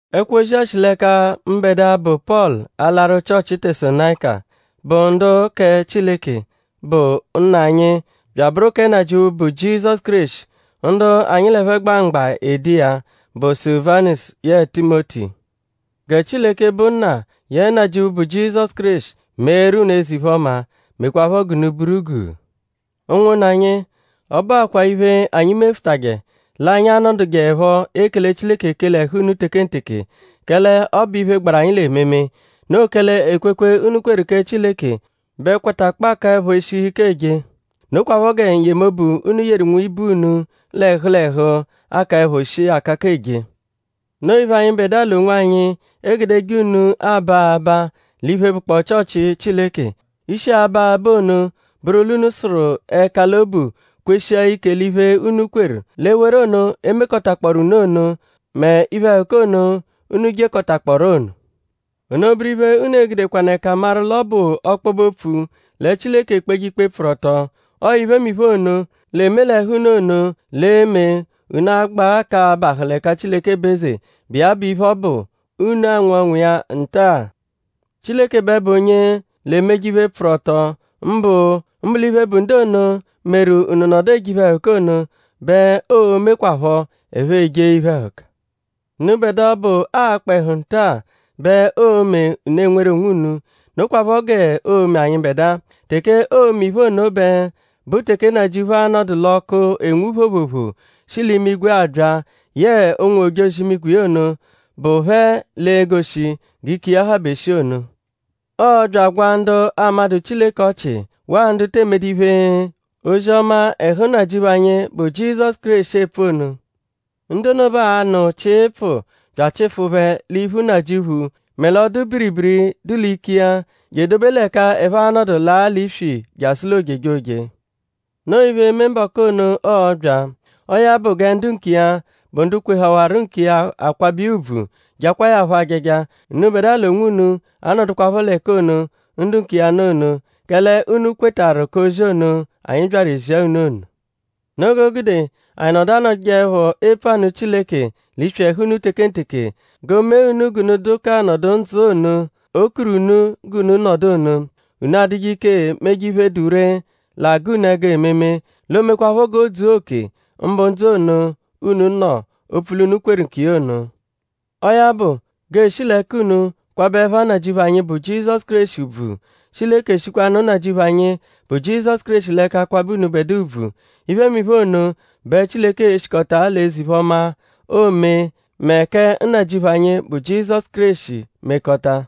Ẹkwo-ozi-a shi l'ẹka mbẹdua, bụ Pọlu alaru Chịochi Tesalonayika, bụ ndu kẹ Chileke, bụ Nna anyi bya abụru kẹ Nnajịuphu, bụ Jizọsu Kéreshi. Ndu anyi ẹphe gba mgba ede iya bụ Sulivanusu yẹe Timoti. Gẹ Chileke, bụ Nna yẹe Nnajịuphu, bụ Jizọsu Kéreshi meeru unu eze-iphe-ọma; mekwaaphọ g'unu buru guu. Ụnwunna anyi; ọ bụakwa iphe, anyi mefụtaje l'anyi a-nọdujeepho ekele Chileke ekele ẹhu unu tekenteke; kẹle ọ bụ iphe, gbaru anyi l'ememe. Noo kẹle ekwekwe, unu kweru kẹ Chileke bẹ kwatakpọo akaẹpho eshihu ike eje; nokwaphọ gẹ n-yemobu, unu yeru nwibe unu l'ẹhu l'ẹhu akaẹpho shii akaka eje. Noo iphe, anyịbedua l'onwanyi egudeje unu aba abaa l'iphe, bụkpoo Chịochi Chileke. Ishi aba abaa ono bụru l'unu sụru ẹka l'obu kweshia ike l'iphe, unu kweru; l'ewere ono, e mekọtakpooru unu ono; mẹ l'iphe-ẹhuka ono, unu jekọtakpooru ono. Ono bụru iphe, unu e-gudekwanụ ẹka maru l'ọ bụ ọkpobe-opfu lẹ Chileke ekpeje ikpe, pfụru ọto. Ọo iphemiphe ono, l'eme l'ẹhu unu ono l'e-me unu agbaa k'abahụ l'ẹka Chileke bụ eze, bụ iya bụ iphe ọbu, unu anwụ ọnwu iya nta-a. Chileke bẹ bụ onye l'emeje iphe, pfụru ọto; mbụ l'iphe, bụ ndu ono, meru unu nọdu eje iphe-ẹhuka ono bẹ oo-mekwaphọ ẹphe ejee iphe-ẹhuka. Unubẹdua ọbu, aakpa ẹhu nta-a bẹ oo-me unu enweru onwunu. Nokwaphọ g'oo-me anyịbedua. Teke oo-me iphe ono bẹ bụ teke Nnajịuphu a-nọdu l'ọku enwu phoophoophoo shi l'imigwe abya yẹe ụnwu-ojozi-imigwe iya ono, bụ phẹ l'e-goshi g'ike iya habe shii ono. Ọo bya agwaa ndu amadụ Chileke ọchi; waa ndu te emedu iphe, ozi-ọma ẹhu Nnajịuphu anyi, bụ Jizọsu Kéreshi epfu ono. Ndu ono bẹ a-nụ chịipfuu bya achịfu phẹ l'iphu Nnajịuphu mẹ l'ọdu-biribiri dụ l'ike iya; je dobe l'ẹka ẹphe a-nọdu laa l'iswi jasụ l'ojejoje. Noo iphe, e-me mbọku ono, ọo-bya. Ọo ya bụ gẹ ndu nkiya, bụ ndu kwehawaru nkiya akwabẹ iya ùbvù; jakwaa ya phọ ajaja. Unubẹdua l'onwunu anọdukwapho l'ẹka ono, ndu nkiya nọ ono; kẹle unu kwetarụ k'ozi ono, anyi byaru ezia unu ono. Noo g'o gude anyi nọdu anọdujeepho epfu anụ Chileke l'iswi ẹhu unu tekenteke; g'o mee unu g'unu dụ k'anọdu ndzụ ono, o kuru unu g'unu nọdu ono. Unu adụje ike meje iphe, dụ ree, l'agụ unu ẹgu ememe. L'o mekwaaphọ g'o dzua oke; mbụ ndzụ ono, unu nọ; opfu l'unu kweru nkiya ono. Ọo ya bụ; g'ee-shi l'ẹka unu kwabẹ ẹpha Nnajịuphu anyi, bụ Jizọsu Kéreshi ùbvù; Chileke eshikwanụ Nnajịuphu anyi, bụ Jizọsu Kéreshi l'ẹka kwabẹ unubẹdua ùbvù. Iphemiphe ono bẹ Chileke e-shikọta l'eze-iphe-ọma, oome mẹ kẹ Nnajịuphu anyi, bụ Jizọsu Kéreshi mekọta.